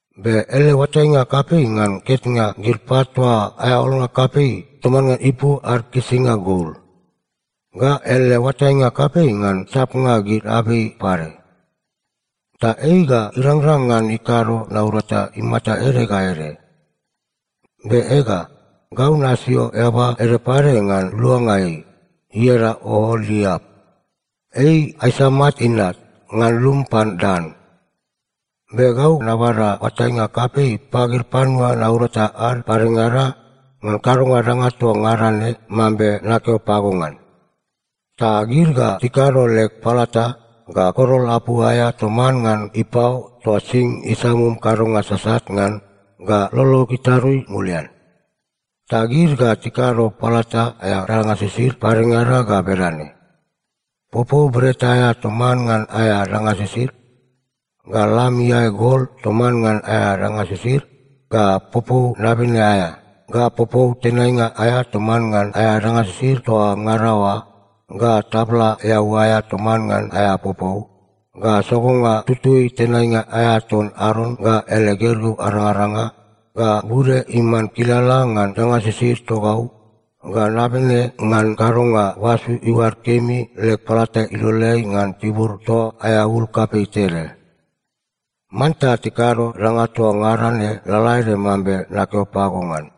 Be ele oatainga kapei ngan ketnga gid pat toa aea olnga kapei toman ngan ipu ad kisinga gol. Ga ele oatainga kapei ngan sapnga gid abei pade. Ta ei ga irangrang ngan ikado naurata imata ede ga ede. Be ega, gau nasio eaba ede pade ngan luanga ei, ieda Ooliap. Ei Aisamak inat ngan lum pan Dan. Be gau nabada oatainga kapei pagid panua naurata ad padengada ngan kadonga danga toa ngada ne mambe nakeo pago ngan. Ta gid ga tikado leg palata, ga korol apu aea toman ngan ipao toa sing isamum kadonga sasat ngan ga lolog itarui mulian. Ta gid ga tikado palata aea danga sisid padengada ga bedane: popou bret aea toman ngan aea danga sisid, ga lam iae gol toman ngan aea danga sisid, ga popou nabene aea, ga popou tenainga aea toman ngan aea danga sisid toa ngada oa, ga tabla eau aea toman ngan aea popou, ga sogonga tutui tenainga aea ton Aron ga ele gergeu arangaranga, ga bude iman kilala ngan danga sisid togau, ga nabene ngan kadonga basu iuad kemi leg palata iloleai ngan tibur toa aea ul kapei tede. Manta tikado danga toa ngada ne lalaede mambe nakeo pago ngan.”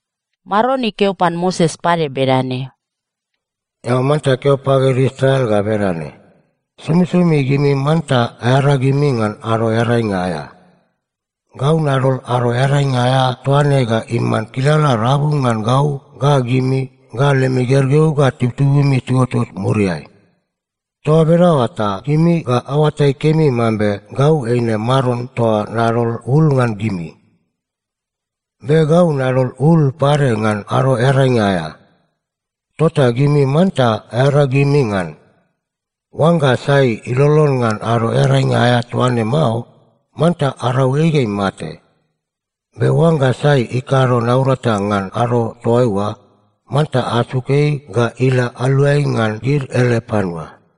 Maron ikeo pan Moses pade bedane, “Eao manta keo pagid Israel ga bedane, ‘Somisomi gimi manta aearagimi ngan Ado Earainga aea. Gau nadol Ado Earainga aea toa ne ga iman kilala rabu ngan gau ga gimi ga lemi gergeu ga tibutibumi tiuotot muriai. Toa bedaoa ta gimi ga aoatai kemi mambe gau eine Maron toa nadol ul ngan gimi. “‘Be gau nadol ul pade ngan Ado Earainga aea. Tota gimi manta aearagimi ngan. Oangga sai ilolon ngan Ado Earainga aea toa ne mao, manta arau ei ga imate. Be oangga sai ikado naurata ngan ado toaiua, manta asuk ei ga ila aluai ngan gid ele panua.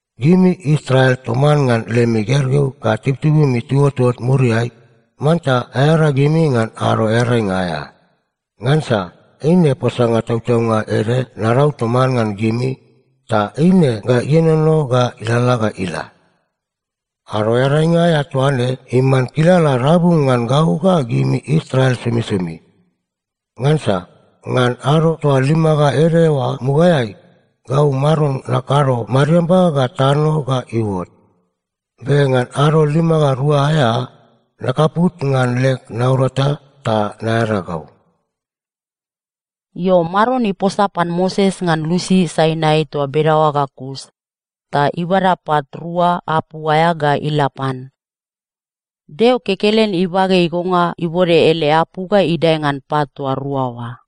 Gimi Israel toman ngan lemi gergeu ga tibutibumi tiuotot muriai, manta aearagimi ngan Ado Earainga aea. Ngansa eine posanga tautaunga ede narau toman ngan gimi, ta eine ga ienono ga ilalala ga ila. Ado Earainga aea toa ne iman kilala rabu ngan gau ga gimi Israel somisomi. Ngansa ngan ado toa lima ga ede oa mugaeai, gau Maron nakado mariamba ga tano ga iuot. Be ngan ado lima ga rua aea, nakaput ngan leg naurata ta naearagau.’” Io, Maron iposa pan Moses ngan lusi Sainai toa bedaoa ga kus, ta ibada pat rua apu aea ga ila pan. Deo kekelen ibage igonga ibode ele apu ga idae ngan pat toa rua oa.